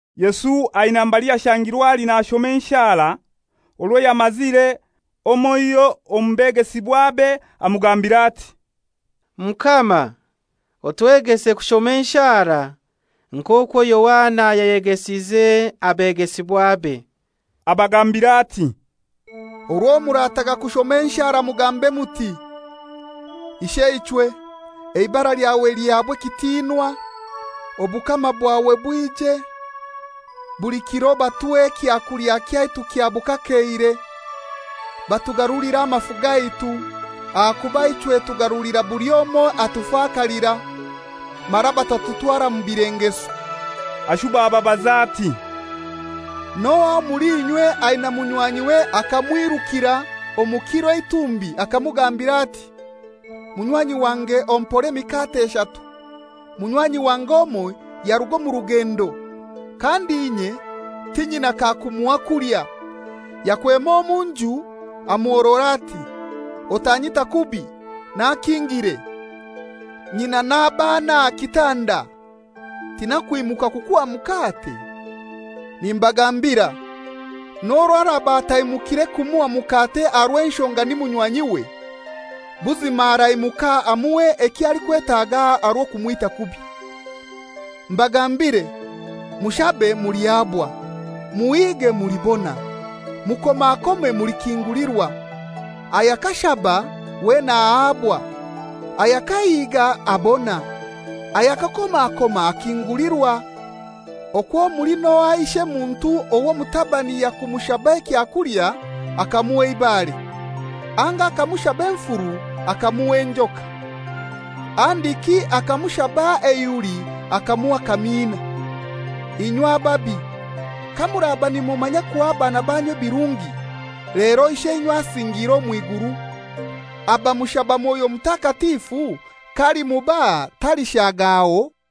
Yesu aina mbali yashangirwe ali nashoma enshara. Orwo yamazire, omoiho omu begesibwabe amugambira ati, «Mukama, otwegese kushoma enshara, nk'okwo Yohana yayegesize abegesibwabe.» Abagambira ati, «Orwo murataga kushoma enshara, mugambe muti, ‹Isheichwe, eibara lyawe lihabwe ekitinwa, obukama bwawe bwije. Buli kiro batuhe ekyakulya kyaitu kya bukakeire; batugarulire amafu gaitu, ahakuba ichwe tugarulira buli omoi atufakalira, mara batatutwara mu bilengeso.›» Ashuba ababaza ati, «N'ohai omuli inywe aina munywanyiwe akamwirukira omu kiro eitumbi akamugambira ati, ‹Munywanyi wange ompore emikate eshatu. Munywanyi wange omoi yaruga omu rugendo, kandi inye tinyina kakumuha kulya.› Yakwema omu nju amuhorora ati, ‹Otanyita kubi, nakingire, nyina n'abaana aha kitanda; tinakwimuka kukuha mukate?› Nimbagambira, n'orwo araba ataimukire kumuha mukate aha rw'enshonga ni munywanyiwe, buzima araimuka amuhe ekyo alikwetaga aha rw'okumwita kubi. Mbagambire, mushabe mulihabwa; muhige mulibona; mukomakome mulikingulirwa. Ayakashaba wena ahabwa; ayakahiga abona; ayakakomakoma akingulirwa. Okwo muli n'ohai ishemuntu ow'omutabani yakumushaba ekyakulya akamuha eibare, anga kumushaba enfuru akamuha enjoka, handiki akamushaba eihuli akamuha akamiina? Inywe ababi, kamuraba nimumanya kuha abaana banyu ebirungi, lero Isheinywe asingiire omw'iguru, abamushaba Mwoyo Mutakatifu k'alimubaha talishaagaho?»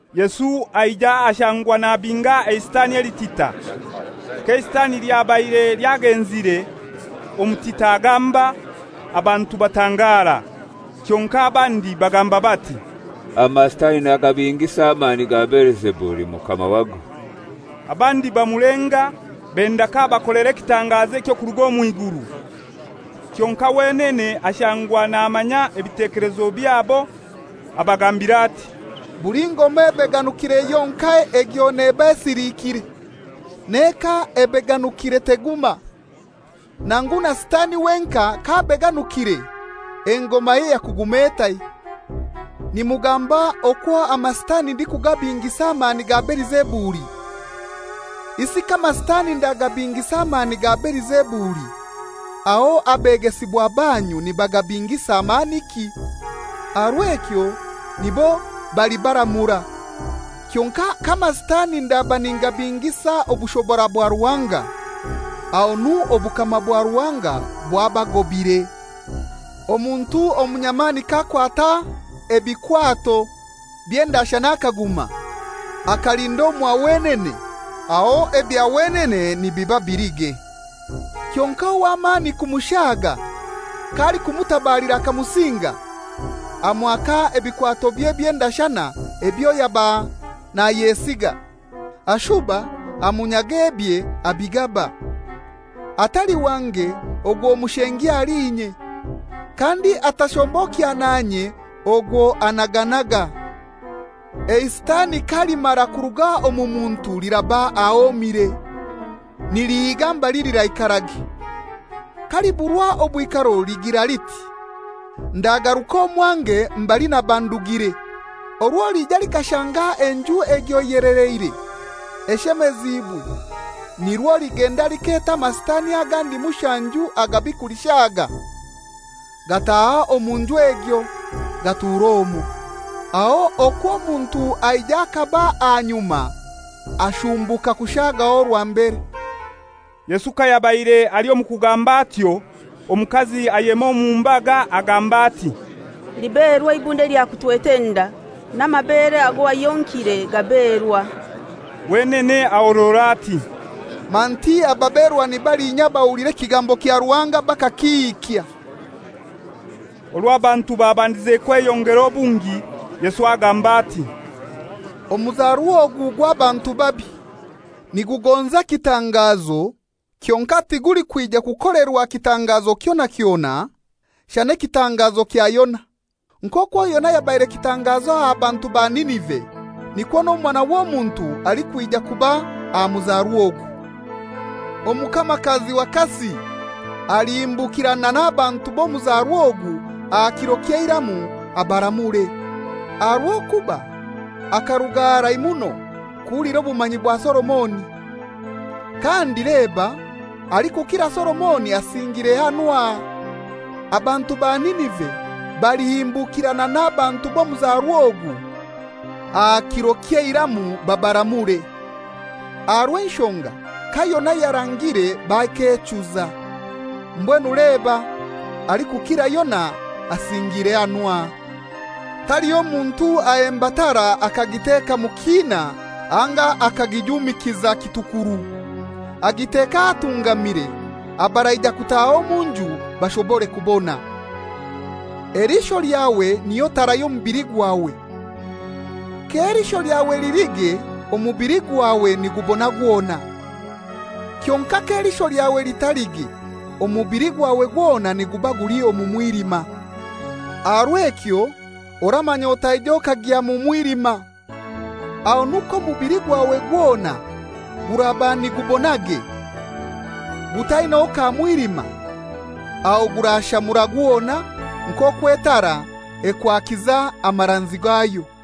Yesu aija ashangwa nabinga eisitani elitita. K'eisitani lyabaire lyagenzire, omutita agamba, abantu batangara. Kyonkai abandi bagamba bati, «Amasitani nagabingisa amani ga Belizebuli, mukama wago.» Abandi bamulenga, benda k'abakolera ekitangazo eky'okuruga omw'iguru. Kyonkai wenene ashangwa namanya ebitekelezo byabo, abagambira ati, «Buli ngoma ebeganukire yonkai egyo neba esilikire. N'eka ebeganukire teguma. Nangu na sitani wenkai k'abeganukiire, engomaye yakuguma etai? Nimugamba ngu mulikugamba okwo amasitani ndikugabingisa amani ga Belizebuli! Isi k'amasitani ndikugabingisa amani ga Belizebuli, aho abegesibwa banyu nibagabingisa maniki? Aha rw'ekyo nibo balibaramura. Kyonkai k'amasitani ndaba ningabingisa obushobora bwa Ruhanga, ahonu obukama bwa Ruhanga bwabagobire. Omuntu omunyamani k'akwata ebikwato by'endashana akaguma, akalinda omwa wenene, aho ebya wenene nibiba bilige. Kyonkai ow'amani kumushaga k'alikumutabalira akamusinga, amwaka ebikwatobye by'endashana ebyo yaba nayesiga, ashuba amunyaga ebye abigaba. Atali wange, ogwo mushengi ahali inye. Kandi atashombokya nanye ogwo anaganaga. «Eisitani kalimara kuruga omu muntu liraba ahomire, nilihiiga mbali liraikarage. K'aliburwa obwikaro ligira liti, ‹Ndagaruka omwange mbali naba ndugire.› Orwo liija lishanga enju egyo eyeleleire, eshemezibwe. Nirwo ligenda likaleta amasitani agandi mushanju agabi kulishaga, gataaha omu nju egyo, gatura omwo. Aho okwo omuntu aija akaba aha nyuma ashumbuka kushagaho orwa mbere.» Yesu kayabaire ali omu kugamba atyo, omukazi ayema omu mbaga agamba ati, «Liberwa eibunda lyakutwete enda, n'amabere ago wayonkire gaberwa!» Wenene ahorora ati, «Manti ababerwa ni balinya abahulira ekigambo kya Ruhanga bakakihikya!» Orwo abantu babandize kweyongera obungi, Yesu agamba ati, «Omuzarwa ogu gw'abantu babi. Nigugonza ekitangazo, kyonkai tigulikwija kukolerwa kitangazo kyona kyona, shana ekitangazo kya Yona. Nk'okwo Yona yabaire kitangazo aha bantu ba Ninive, nikwo n'Omwana w'Omuntu alikwija kuba aha muzarwa ogu. Omukamakazi wa kasi alihimbukirana n'abantu b'omuzarwa ogu aha kiro ky'eiramu abaramure; aha rw'okuba akaruga harai muno kuhulira obumanyi bwa Solomoni, kandi leba alikukira Solomoni asingiire hanu aha. Abantu ba Ninive balihimbukirana n'abantu b'omuzarwa ogu aha kiro ky'eiramu babaramure, aha rw'enshonga ka Yona yarangire bakechuza; mbwenu leba alikukira Yona asingiire hanu aha.» «Taliho muntu ahemba tara akagiteka mu kiina anga akagijumikiza kitukuru. Agiteka ahatungamire, abaraija kutaaha omu nju bashobore kubona. Eliisho lyawe niyo tara y'omubili gwawe. K'eliisho lyawe lilige, omubili gwawe nigubona gwona. Kyonkai k'eliisho lyawe litalige, omubili gwawe gwona niguba guli omu mwilima. Aha rw'ekyo oramanya otaija okagya omu mwilima. Ahonu k'omubili gwawe gwona guraba nigubonage, gutainaho ka mwilima, aho gurashamura gwona, nk'okwo etara ekwakiza amaranzi gayo.»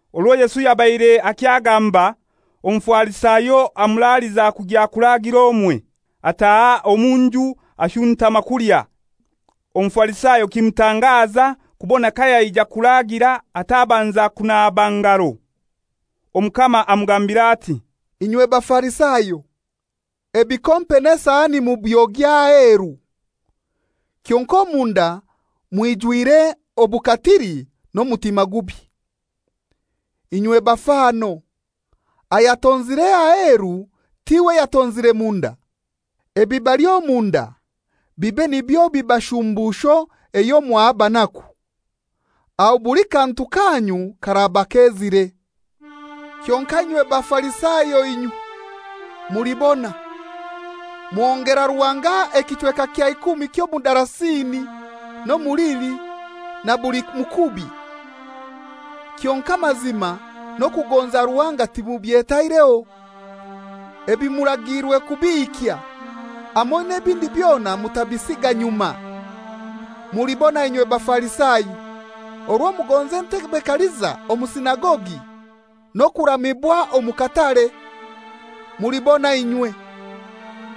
Orwo Yesu yabaire akyagamba, Omufarisayo amuraliza kugya kuraagira omwe. Ataaha omu nju ashuntama kulya. Omufarisayo kimutangaza kubona kayaija kuragira atabanza kunaba ngaro. Omukama amugambira ati, «Inywe Abafarisayo, ebikompe n'esahani mubyogya aheru, kyonkai omunda mwijwire obukatili n'omutima gubi. Inywe bafano! Ayatonzire aheru tiwe yatonzire munda? Ebibali omunda bibe nibyo biba shumbusho eyo mwaha abanaku; aho buli kantu kanyu karaba kezire. «Kyonkai inywe Bafarisayo inywe, mulibona! Muhongera Ruhanga ekichweka kya ikumi ky'omudarasini, n'omulili, na buli mukubi; kyonkai amazima n'okugonza Ruhanga timubyetaireho. Ebi muragiirwe kubihikya, hamoi n'ebindi byona kutabisiga nyuma. Mulibona inywe Bafarisayo! Orwo mugonza entebe kaliza omu sinagogi n'okuramibwa omu katare. Mulibona inywe!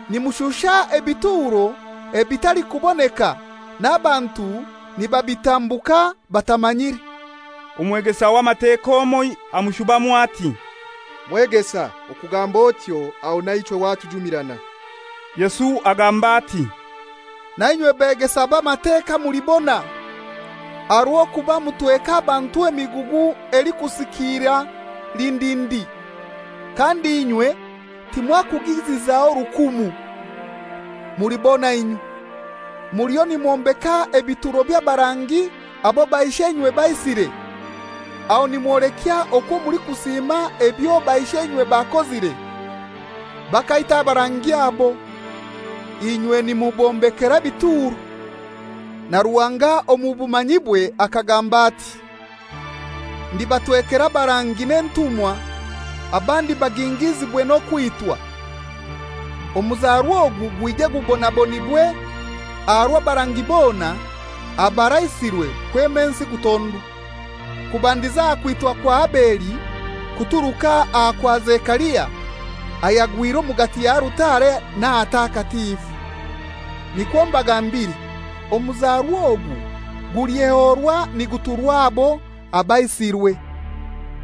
Nimushusha ebituro ebitalikuboneka, n'abantu nibabitambuka batamanyire.» Omwegesa w'Amateka omoi amushubamu ati, «Mwegesa, okugamba otyo aho naichwe watujumirana.» Yesu agamba ati, «Na inywe beegesa b'Amateka mulibona! Aha rw'okuba mutweka abantu emigugu elikusikiira lindindi, kandi inywe timwakugizizaho rukumu. Mulibona inywe! Muliyo nimwombeka ebituro by'abarangi abo baisheinywe baisire. Aho nimwolekya okwo mulikusiima ebyo baisheinywe bakozire. Bakaita abarangi abo, inywe nimubombekera ebituro. Na Ruhanga omu bumanyibwe akagamba ati, ‹Ndibatwekera abarangi n'entumwa, abandi bagingiizibwe n'okwitwa,› omuzarwa ogu gwije gubonabonibwe aha rw'abarangi bona abaraisirwe kwema ensi kutondwa, kubandiza aha kwitwa kwa Abeli kuturuka aha kwa Zekaria, ayagwire omugati ya altare n'ahatakatifu. Nikwo mbagambire, omuzarwa ogu gulyehorwa niguturwa abo abaisirwe.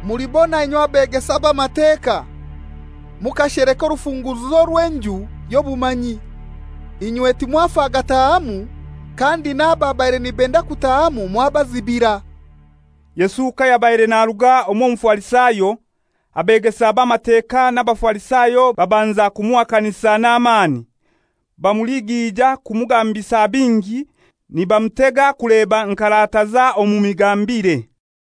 Mulibona inywe beegesa b'Amateka! Mukasheleka orufunguruzo rw'enju y'obumanyi; inywe timwafa gatahamu, kandi n'ababaire nibenda kutahamu mwabazibira.» Yesu kayabaire naruga omw'Omufarisayo, abeegesa b'Amateka n'Abafarisayo babanza kumuhakanisa n'amani, bamuligiija kumugambisa bingi, nibamutega kuleba nk'arataza omu migambire.